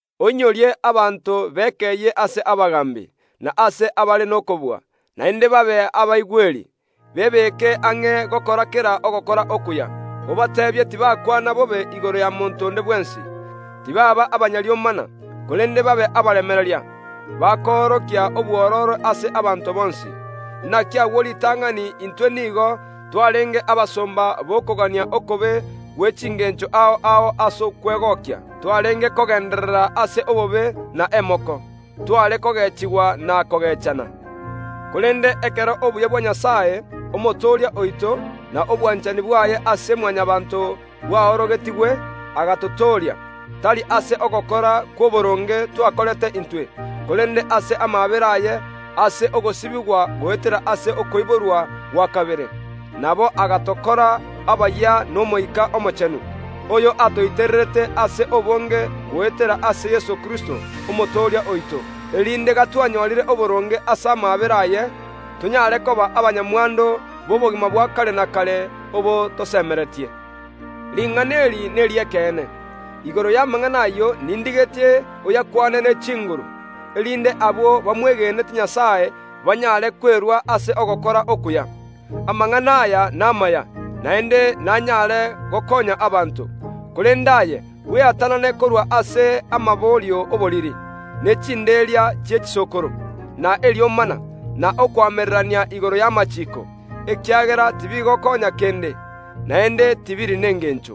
Oinyorie abanto bao bekeyie ase abagaambi, na ase abare nokobua, naende babe abaigweri, ase kera enchera bebeke ang’e gokora ogokora okuya. Obateebie tibakwana bobe igoro ya monto onde bwensi, korende barabwo babe abanto b’omorembe n’obosaani, babe abaremereria naende abakoorokia obwororo ase abanto bonsi. Inaki agwo ritang’ani naintwe nigo twarenge abariri, abaenenu, na abang’ainegete. Nigo twarenge abosomba b’okogania okobe gwe chingeencho ao ao ase okwegokia. Tokamenya ase obobe n’emoko, tokogeechigwa na kogeechana. Korende ekero oboitongo na obwanchani bwa Nyasae, Omotooria oito bwaorogetigwe, ere agatotooria, tari ase ogokora kw’oboronge twakorete intwe, korende ase amaabera aye ere omonyene ogosibigwa goetera ase Omoika Omochenu oyio ogotoa okoiborwa okoyia, na obogima oboyia. Oyo atoitererete Omoika Omochenu ase obonge goetera ase Yeso Kristo, Omotooria oito, erinde obuya bwaye, tonyore oboronge ase ere Nyasae Omobui erio, tonyaare koba abanyamwando b’obogima bwa kare na kare, obwo tosemeretie. Ring’ana eri neri’ekeene. Igoro y’amang’ana ayio nindigetie oyakwane ne chinguru, erinde abwo bamwegenete Nyasae banyaare kwerua ase ogokora okuya. Amang’ana aya namaya, naende nanyare gokoonya abanto bonsi. Korende aye, bweatanane korwa ase amaborio y’oboriri, n’omoroberio omotambe bwe chinderia chi’echisokoro, na eriomana, na okoamererania igoro y’amachiiko, ekiagera tibigokoonya kende, naende tibiri nengeencho.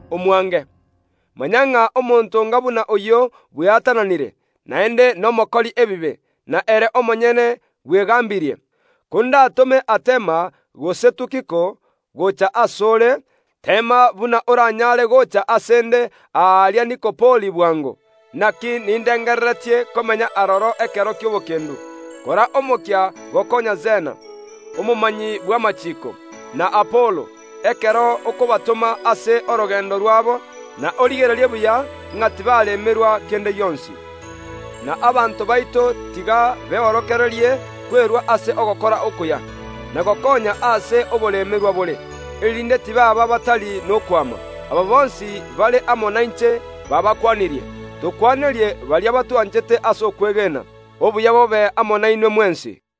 Nomanyete buna omonto onga buna oyio nomosareku, naende ebibe biaye biamwatananire, nere omonyene bwegaambirie. Kondatome Artemas gose Tukiko gocha ase ore, teema buna oranyaare gocha ase ’nde aria Nikopoli bwango, inaki nindengereretie komenya aroro ekero gi’etoigo. Kora omokia gokoonya Zena, omonogeri bw’amachiiko, na Apolo, ekero okobatoma ase orogeendo rw’abo, na origererie buya ng’a ’mbabwate kera ekemo keria baganetie. Na abanto baito tiga beorokererie kwerua ase ogokora okuya, na gokoonya aase oboremerwa bore ase ekeene, erinde tibaaba abataisaini kende gionsi. Aba bonsi bare amo nainche bagokwanirie. Tokwanerie baria abasani baito ase okwegena. Obuya bwa Nyasae Omobui bobe ase more mwensi. Obuya bobe amo nainwe mwensi.